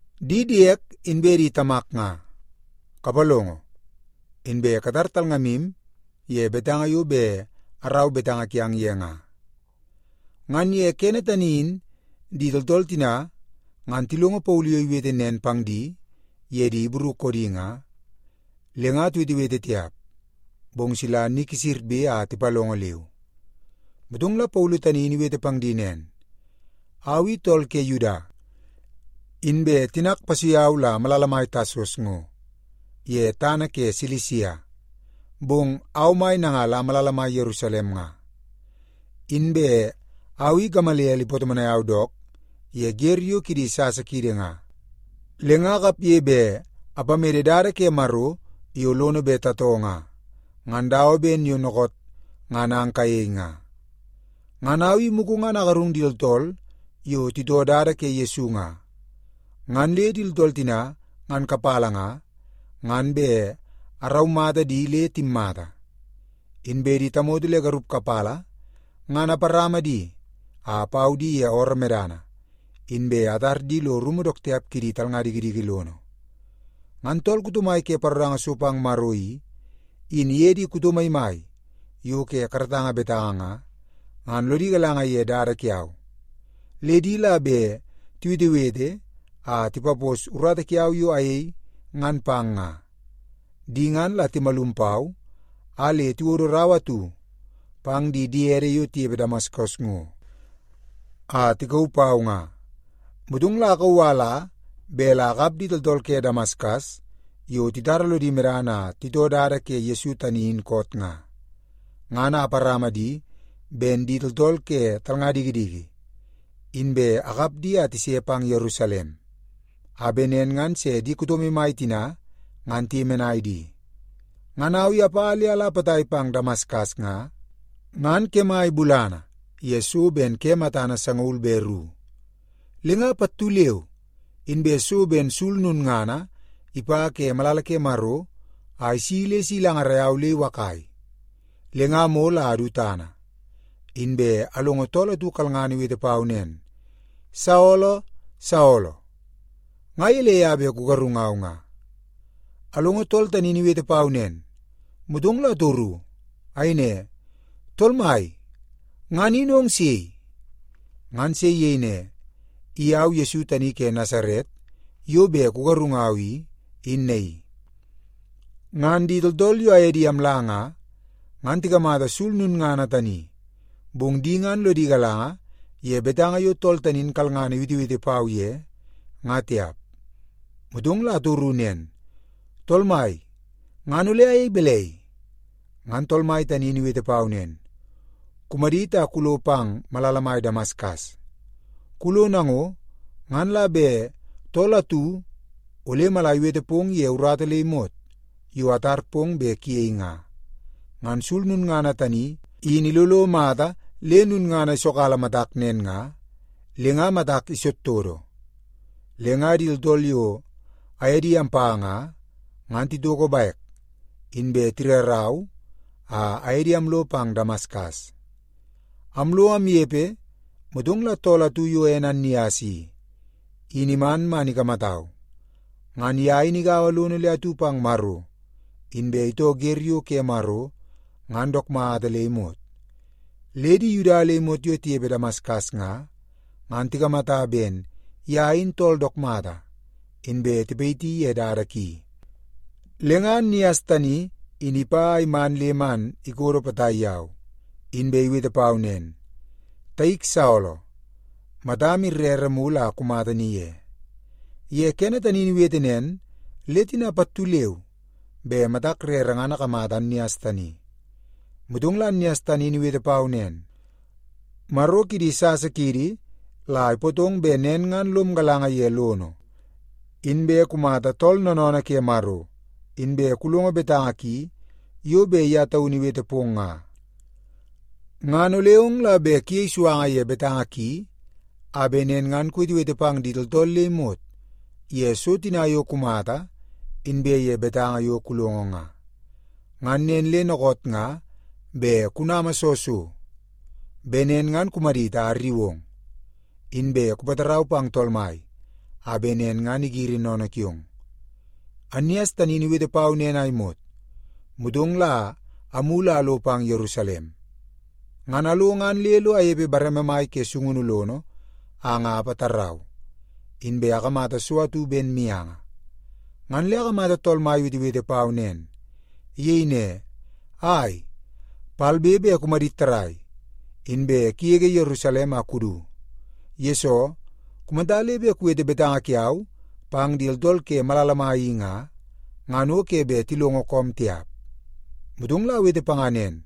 “Di diek inbe di tamak nga, kapalongo. Inbe katar talngamu ye betanga yo bet arau betanga kiang ye nga.” Ngan ye kene tani in di tooltool tina ngan tilongo Paulu yo iwete nen pang di ye di Ibru koodi nga, le nga tiwetewete tiap, bong sila ni kisirbe a tipalongo leu. Motong la Paulu tani in iwete pang di nen, “Au i tool ke Yuda, inbe tinak ipasui au la malala mai Tasas ngo ye tana ke Silisia, bong au mai nanga la malala mai Yerusalem nga. Inbe au i Gamaliel ipatomonai au dook ye wer yo kidi sasa kiidi nga, le nga akapge bet apamede dada ke Maro yo lono bet tatoo nga, ngan dawa ben yo dookoot ngan ang kayei nga. Ngan au i mugu ngan agarung di tooltool yo titoo Dada ke Yesu nga, ngan le di tooltool tina ngan kapala nga, ngan bet araumata di le timmata. Inbe di tamoto le garup kapala ngan aparama di a apau di ye ooroo medana, inbe atar di lo rumu dook tiap kidi talnga dikidiki lono. Ngan tool kuto mai ke paroranga so pang Maro i, in iye di kuto maimai yo ke karatanga betanga nga, ngan lodi galanga ye dada kiau, le di la bet tiwetewete a tipapos urata kiau yo ayei ngan pang nga. Di ngan la timalum pau a le tiwodo rau atu pang di diede yo tinepe Damaskas ngo a tikauu pau nga. Motong la akauu a ala bet la akap di tooltool ke Damaskas yo titara lodi medana a titoo Dada ke Yesu tani in koot nga, ngan a aparama di ben di tooltool ke talnga dikidiki, inbe akap di a tise pang Yerusalem, a bet nen ngan se di kuto maimai tina ngan tiyemenai di. “Ngan au i apa le ala potai pang Damaskas nga, ngan kemai bulana ye so ben ke matana sangaul be ru. Le nga pattu leu inbe so ben sul lulngana ipa ke malala ke Maro a si le si ilangarai au le iwakai. Le nga amol a adu tana, inbe alongo tool atu kalngana iwete pau nen, ‘Saolo! Saolo! Nga gelei a bet kugarungau nga?’ “Alongo tool tani in iwete pau nen, motong la atoru. Ayei ne, ‘Tool Mai, ngan in ong sei?’ “Ngan se iyei ne, ‘I au Yesu tani ke Nasaret yo bet kugarungau i, in naii.’ Ngan di tooltool yo aye di amla nga, ngan tikamata sul lulngana tani, bong di ngan lodi galanga ye betanga yo tool tani in kalngana iwetewete pau ye, nga tiap. “Motong la atoru nen, ‘Tool Mai, ngan ole ayei balai?’ “Ngan Tool Mai tani in iwete pau nen, ‘Kumadit a kulo pang malala mai Damaskas. Kulo nango, ngan la bet tool atu ole mala iwete pong ye urata le imot yo atar pong bet kuyei nga.’ Ngan sul lulngana tani in ilolo mata le lulngana isokkala matak nen nga, le nga matak todotodo. Le nga di tooltool yo aye di ampa nga, ngan titoko bek, inbe tirarau a aye di amlo pang Damaskas. “Amlo amnepe, motong la tool atu yo ene Annias i, in iman man ikamatau. Ngan ye in igaua lono le atu pang Maro, inbe itoo wer yo ke Maro ngan dook mata le imot. Le di Yuda le imot yo tinepe Damaskas nga, ngan tikamata ben ye in tool dook mata, inbe tipayiti ye dada ki. Le nga Annias tani in ipa a iman le man ikodo potai yau, inbe iwete pau nen, ‘Taik Saolo, matam rere mulu a kumata ni ye.’ Ye kene tani in iwete nen, le tina pattu leu be matak rere ngan akamata Annias tani. “Motong la Annias tani in iwete pau nen, ‘Maro kidi sasa kiidi la ipootong bet nen ngan lom galanga ye lono, inbe kumata Tool Noonoonoo ke Maro, inbe kulongo betanga ki yo bet ye taunu iwete pong nga. Ngan ole ong la bet kuyei suanga ye betanga ki, a bet nen ngan kuwetewete pang di tooltool le imot ye so tina yo kumata inbe ye betanga yo kulongo nga. Ngan nen le dookoot nga bet kunama soo so? Bet nen ngan kumadit a arriu ong, inbe kupatarau pang Tool Mai a bet nen ngan igiri sennene kiong.’ “Annias tani in iwete pau nen a imot, motong la amulu a alo pang Yerusalem. Ngan alo ngan le lo anepe bareme mai ke sungunu lono a nga apatarau, inbe akamata so atu ben mianga, ngan le akamata Tool Mai iwetewete pau nen. Iyei ne, ‘Ai, palbe be kumadit tarrai, inbe kugege Yerusalem a kudu. Yesoo, kumata le bet kuwete betanga kiau pang di tooltool ke malala mai i nga, ngan o ke bet tilongo koom tiap.’ “Motong la awete panga nen,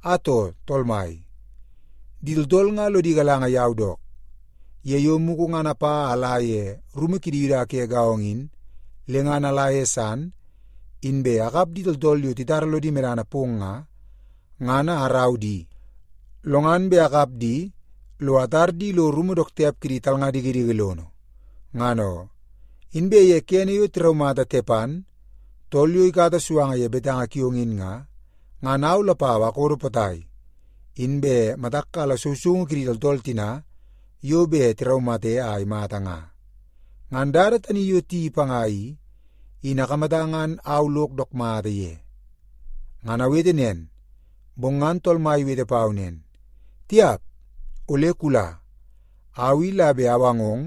‘Atoo, Tool Mai, di tooltool nga lodi galanga yau dook, ye yo mugu ngan apa a ala ye rumu kidi Yuda ke gaongo in, le ngan ala ye san, inbe akap di tooltool yo titara lodi medana pong nga, ngan a arau di, lo ngan bet akap di lo atar di lo rumu dook tiap kidi talnga dikidiki lono, ngan oo. Inbe ye kene yo tiraumata Tepan, tool yo ikata suanga ye betanga kiong in nga, ngan au lapau akodo potai, inbe matak kala sousoungu kidi tooltool tina yo bet tiraumate a imata nga. Ngan dada tani yo tiyeii panga i, in akamata ngan au lok dook mata ye.’ “Ngan awete nen, bong ngan Tool Mai iwete pau nen, ‘Tiap, ole kula. Au i la bet awangong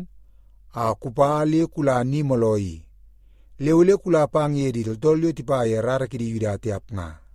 a kupa le kula ni mooloo i. Le ole kula pang ye di tooltool yo tipa ye rara kidi Yuda tiap nga.’”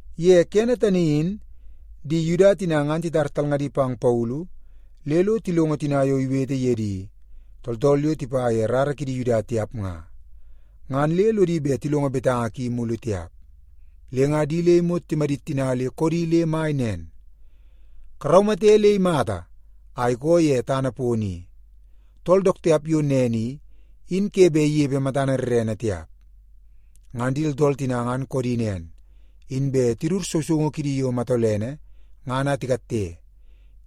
Ye kene tani in di Yuda tina ngan titar talngadi pang Paulu le lo tilongo tina yo iwete ye di tooltool yo tipa ye rara kidi Yuda tiap nga, ngan le lodi bet tilongo betanga ki mulu tiap. Le nga di le imot timadit tina le koodi le mai nen, “Karaumate le imata a ikoo ye tana pono i! Tool dook tiap yo nen i, in ke bet inepe matana rrene tiap!” Ngan di tooltool tina ngan koodi nen, inbe tidut sousoungu kidi yo matolene ngan a tikatte,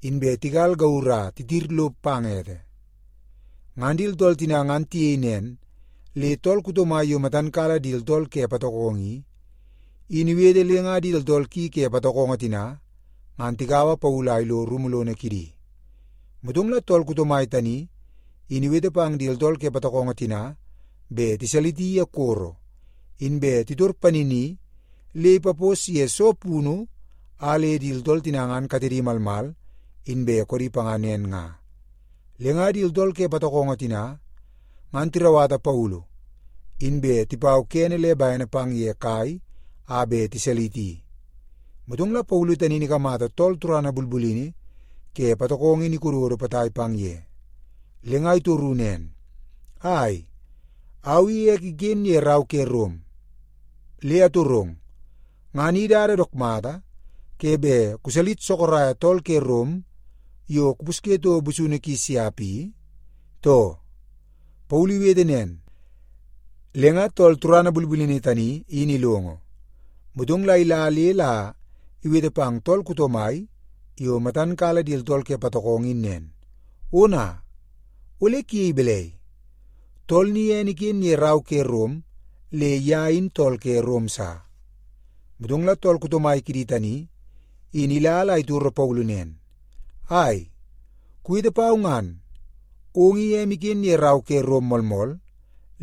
inbe tigal gauru a titir lo pang ete. Ngan di tooltool tina ngan tiyei nen, le tool kuto mai yo matan kala di tooltool ke patokongo i, in iwete le nga di tooltool ki ke patokongo tina ngan tikaua Paulu a ilo rumu lono kidi. Motong la tool kuto mai tani in iwete pang di tooltool ke patokongo tina bet tiwalisi ye koro, inbe titor panini le ipapos ye soo punu a le di tooltool tina ngan katedi malmal inbe koodi panga nen nga. Le nga di tooltool ke patokongo tina, ngan tirauwata Paulu, inbe tipau kene le bene pang ye kai a bet tiwalisi. Motong la Paulu tani in ikamata tool turana bulbulini ke patokongo in ikododo potai pang ye, le nga itoru nen, “Ai, au i ek iken ye rau ke Rom. Le atorong, ngan i dada dook mata ke bet kuwalis sorok tool ke Rom yo kupusye toko busunu ki siap i, too?” Paulu iwete nen, le ngan tool turana bulbulini tani in ilongo, motong la ila la iwete pang tool kuto mai yo matan kala di tooltool ke patokongo in nen, “Ona, ole kuyei balai? Tool ni ene iken ye rau ke Rom le ye in tool ke Rom sa.” Motong la tool kuto mai kidi tani in ila la itoro Paulu nen, “Ai, kuwete pau ngan. Ong i em iken ye rau ke Rom moolmool,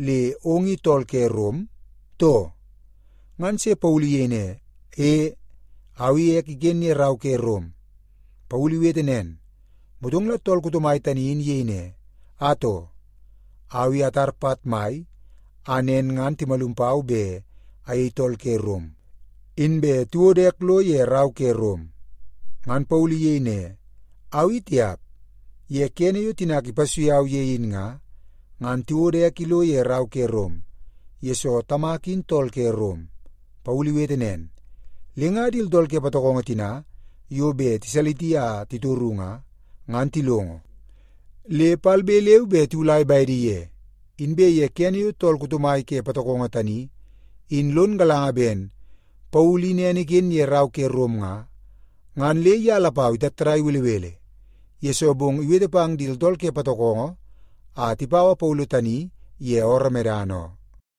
le ong i tool ke Rom, too?” Ngan se Paulu iyei ne, “E, au i ek iken ye rau ke Rom.” Paulu iwete nen, motong la tool kuto mai tani in iyei ne, “Atoo, au i atara pat mai a nen ngan timalum pau bet ayei tool ke Rom inbe tiwodo ek lo ye rau ke Rom.” Ngan Paulu iyei ne, “Au i tiap. Ye kene yo tinak ipasui au ye in nga, ngan tiwodo ek ilo ye rau ke Rom, yesoo tamak in tool ke Rom.” Paulu iwete nen, le nga di tooltool ke patokongo tina yo bet tiwalisi a titoru nga, ngan tilongo, le palbe leu be tiwulai bedi ye. Inbe ye kene yo tool kuto mai ke patokongo tani in lon galanga ben Paulu in ene iken ye rau ke Rom nga, ngan le ye lapau itattadai belebele, yesoo bong iwete pang di tooltool ke patokongo a tipaua Paulu tani ye ooroo medana oo.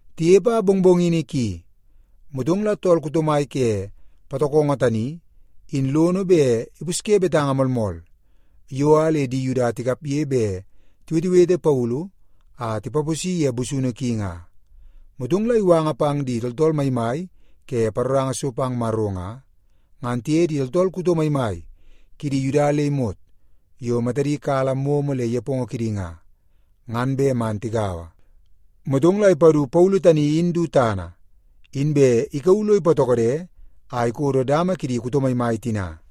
Tinepe a mongmongini ki, motong la tool kuto mai ke patokongo tani in lono bet ipusye betanga moolmool, yo a le di Yuda tikapge bet tiwetewete Paulu a tipaposi ye busunu ki nga. Motong la iwanga pang di tooltool maimai ke paroranga so pang Maro nga, ngan tiye di tooltool kuto maimai kidi Yuda le imot yo matadi kala momo le nepongo kidi nga, ngan bet man tigaua. Motong la ipadu Paulu tani in du tana, inbe ikauu lo ipatokode a ikodo dama kidi kuto maimai tina.